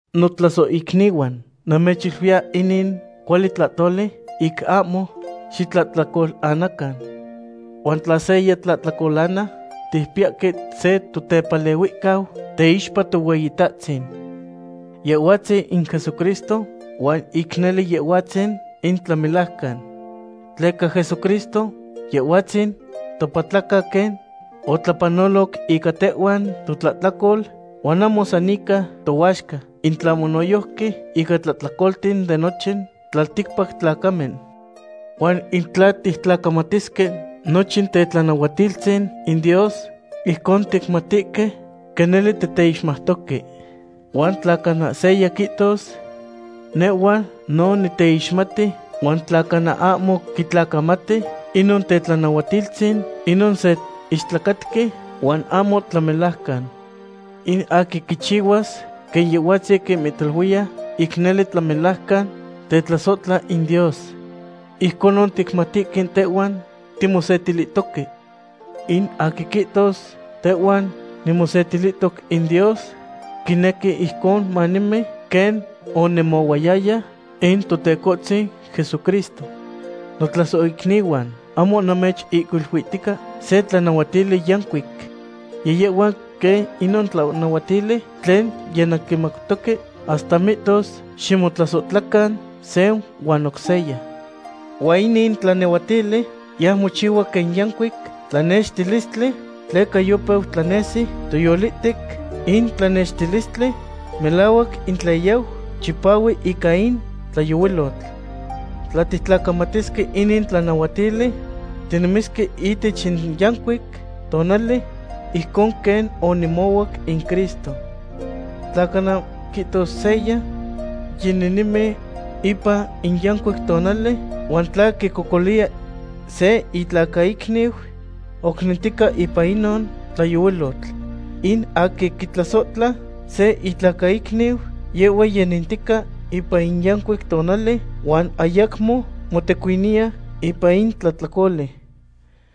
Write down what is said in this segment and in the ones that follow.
Notlasohicnihuan, namechiluiya inin cuali tlahtoli ic ahmo xitlahtlacolanacan. Huan tla seya tlahtlacolana, ticpiyahque se Totepalehuihcau teixpa Tohueyitahtzin. Yehhuatzin in Jesucristo huan ic nele Yehhuatzin in tlamelajcan. Tleca Jesucristo Yehhuatzin topatlaca quen otlapanoloc ica tehhuan totlahtlacol, huan ahmo san ica tohuaxca, in tlahmo noyojqui ica tlahtlacolten de nochin tlalticpac tlacamen. Huan in tla tictlacamatisque nochin tetlanahuatiltzin in Dios, ijcon ticmatihque quen nele titeixmautoque. Huan tla cana seya quihtos: “Nehhua no niteixmati”, huan tla cana ahmo quitlacamati inon tetlanahuatiltzin, inon se istlacatqui, huan ahmo tlamelajcan. In aquin quichihuas quen Yehhuatzin quimihtaluiya, ic nele tlamelajcan tetlasohtla in Dios. Ijconon ticmatihque tehuan timosetilihtoque. In aquin quihtos: “Tehuan nimosetilihtoc in Dios”, quinequi ijcon manemi quen onemohuayaya in Totecohtzin Jesucristo. Notlasohicnihuan, ahmo namechihcuiluihtica se tlanahuatili yancuic. Yiyehhua quen inon tlanahuatili tlen yinanquimautoque hasta mihtos ximotlasohtlacan se huan oc seya. Huan inin tlanahuatili yau mochihua quen yancuic tlanextilistli tleca yopeu tlanesi toyolihtec in tlanextilistli melahuac in tlen yau chipahui ica in tlayohuilotl. Tla tictlacamatisque inin tlanahuatili, tinemisque ihtech in yancuic tonali ijcon quen onemohuac in Cristo. Tla cana quihtos seya: “Yininemi ipan in yancuic tonali”, huan tla quicocoliya se itlacaicniu, oc nentica ipan inon tlayohuilotl. In aquin quitlasohtla se itlacaicniu, yehhua yinentica ipan in yancuic tonali huan ayacmo motecuiniya ipan in tlahtlacoli.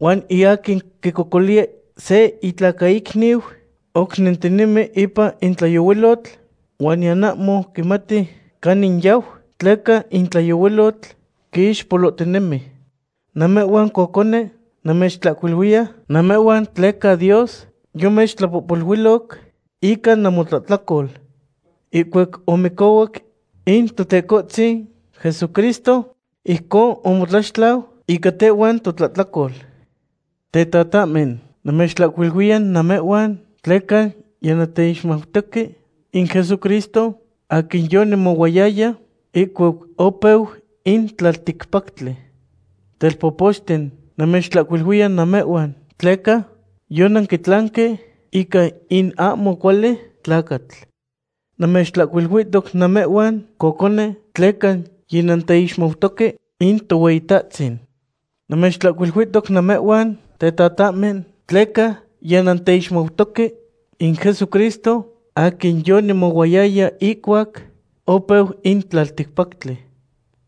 Huan in aquin quicocoliya se itlacaicniu oc nentinemi ipan in tlayohuilotl huan niyan ahmo quimati canin yau, tleca in tlayohuilotl quiixpolohtinemi. Namehhuan cocone, namechtlahcuiluiya namehhuan tleca Dios yomechtlapohpoluiloc ica namotlahtlacol. Ihcuac omicohuac in Totecohtzin Jesucristo ijcon omotlaxtlau ica tehhuan totlahtlacol. Tetatahmen, namechtlahcuiluiya namehhuan tleca yinanteixmautoque in Jesucristo aquin yonemohuayaya ihcuac opeu in tlalticpactli. Telpopochten, namechtlahcuiluiya namehhuan tleca yonanquitlanque ica in ahmo cuali tlacatl. Namechtlahcuiluihtoc namehhuan, cocone, tleca yinanteixmautoque in Tohueyitahtzin. Namechtlahcuiluihtoc namehhuan, tetatahmen, tleca yinanteixmautoque in Jesucristo aquin yonemohuayaya ihcuac opeu in tlaltipactli.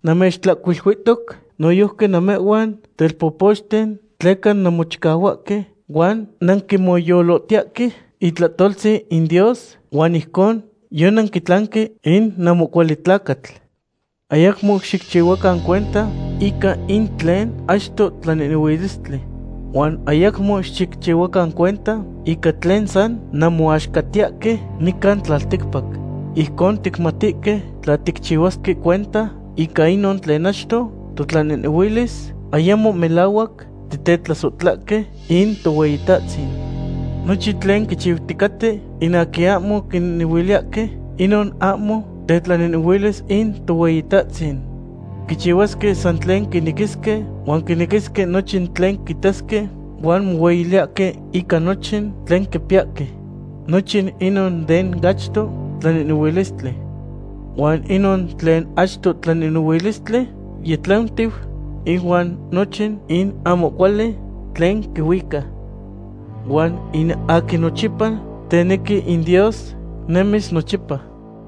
Namechtlahcuiluihtoc noyojqui namehhuan, telpopochten, tleca nanmochicahuahque huan nanquimoyolotiyahque itlahtoltzin in Dios, huan ijcon yonanquitlanque in ahmo cuali tlacatl. Ayacmo xicchihuacan cuenta ica in tlen achto tlanehnehuilistli. Huan ayacmo xicchihuacan cuenta ica tlen san nanmohuaxcatiyahque nican tlalticpac. Ijcon ticmatihque tla ticchihuasque cuenta ica inon tlen achto totlanehnehuilis, ayamo melahuac titetlasohtlahque in Tohueyitahtzin. Nochin tlen quichiuticaten in aquin ahmo quinehnehuiliyahque, inon ahmo tetlanehnehuilis in Tohueyitahtzin. Quichihuasque san tlen quinequisque, huan quinequisque nochin tlen quitasque, huan mohueyiliyahque ica nochin tlen quipiyahque. Nochin inon den achto tlanehnehuilistli. Huan inon tlen achto tlanehnehuilistli yitlantiu, ihuan nochin in ahmo cuali tlen quihuica. Huan in aquin nochipa tenequi in Dios nemis nochipa.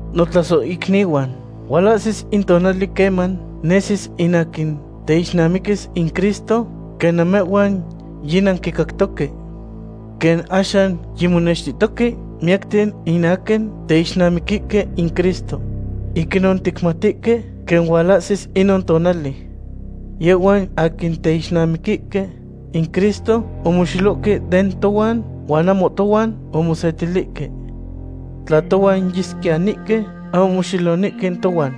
Notlasohicnihuan, hualahsis in tonali queman nesis in aquin teixnamiquis in Cristo, quen namehhuan yinanquicactohque. Quen axan yimonextihtohque miyacten in aquin teixnamiquihque in Cristo. Ic inon ticmatihque quen hualahsis inon tonali. Yehhuan aquin teixnamiquihque in Cristo omoxelohque den tohuan, huan ahmo tohuan omosetilihque. Tla tohuan yesquiyanihque, ahmo moxelonihque tohuan.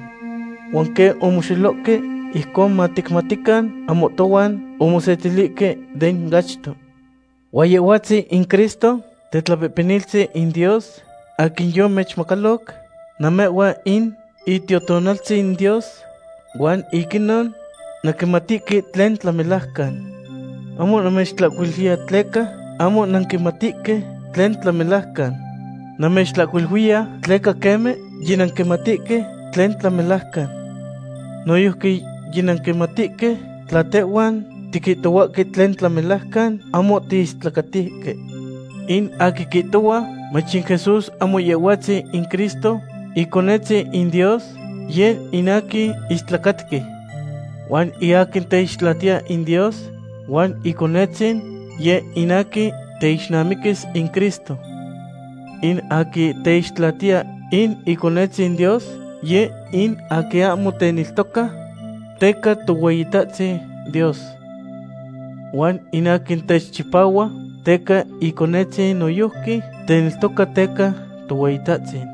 Huan quen omoxelohque, ijcon maticmatican ahmo tohuan omosetilihque den achto. Huan Yehhuatzin in Cristo Tetlapehpeniltzin in Dios aquin yomechmacaloc namehhuan in Itiotonaltzin Dios, huan ic inon nanquimatihque tlen tlamelajcan. Ahmo namechtlahcuiluiya tleca ahmo nanquimatihque tlen tlamelajcan. Namechtlahcuiluiya tleca queme yinanquimatihque tlen tlamelajcan. Noyojqui yinanquimatihque tla tehhuan tiquihtohuahque tlen tlamelajcan, ahmo tiistlacatihque. In aquin quihtohua mach in Jesús ahmo Yehhuatzin in Cristo, Iconetzin in Dios, yeh in aquin istlacatqui. Huan in aquin teixtlatiya in Dios huan Iconetzin, yeh in aquin teixnamiquis in Cristo. In aquin teixtlatiya in Iconetzin Dios, yeh in aquin ahmo teneltoca teca Tohueyitahtzin Dios. Huan in aquin techipahua teca Iconetzin noyojqui teneltoca teca Tohueyitahtzin.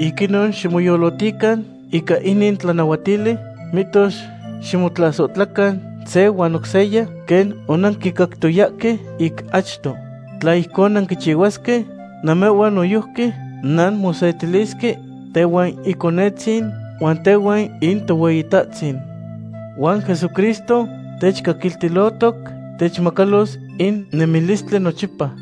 Ic inon ximoyolotican ica inin tlanahuatili, mihtos ximotlasohtlacan se huan oc seya quen onanquicactoyahque ic achto. Tla ijcon nanquichihuasque, namehhuan noyojqui nanmosetilisque tehuan Iconetzin huan tehuan in Tohueyitahtzin. Huan Jesucristo techcaquiltilohtoc techmacalos in nemilistli nochipa.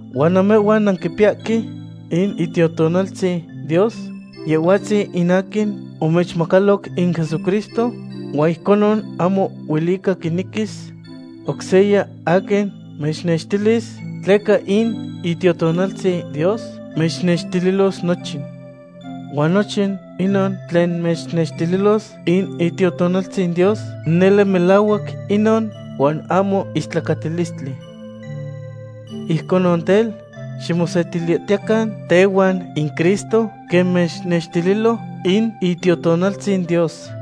Huan namehhuan nanquipiyahque in Itiotonaltzin Dios, Yehhuatzin in aquin omechmacaloc in Jesucristo, huan ijconon ahmo huelica quinequis oc seya aquin mechnextilis, tleca in Itiotonaltzin Dios mechnextililos nochin. Huan nochin inon tlen mechnextililos in Itiotonaltzin Dios, nele melahuac inon huan ahmo istlacatilistli. Ijcon tel, ximosetilihtiyecan tehuan in Cristo, quen mechnextililo in Itiotonaltzin Dios.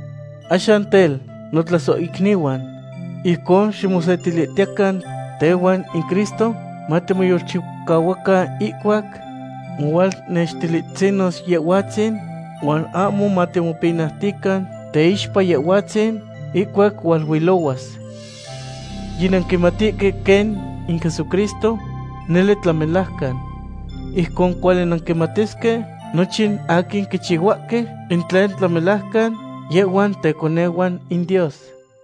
Axan tel, notlasohicnihuan, ijcon ximosetilihtiyecan tehuan in Cristo, matimoyolchicahuacan ihcuac mohualnextihtzinos Yehhuatzin, huan ahmo matimopinautican teixpa Yehhuatzin ihcuac hualuilohuas. Yinanquimatihque quen in Jesucristo nele tlamelajcan. Ijcon cuali nanquimatisque nochin aquin quichihuahque in tlen tlamelajcan, yehhuan teconehuan in Dios.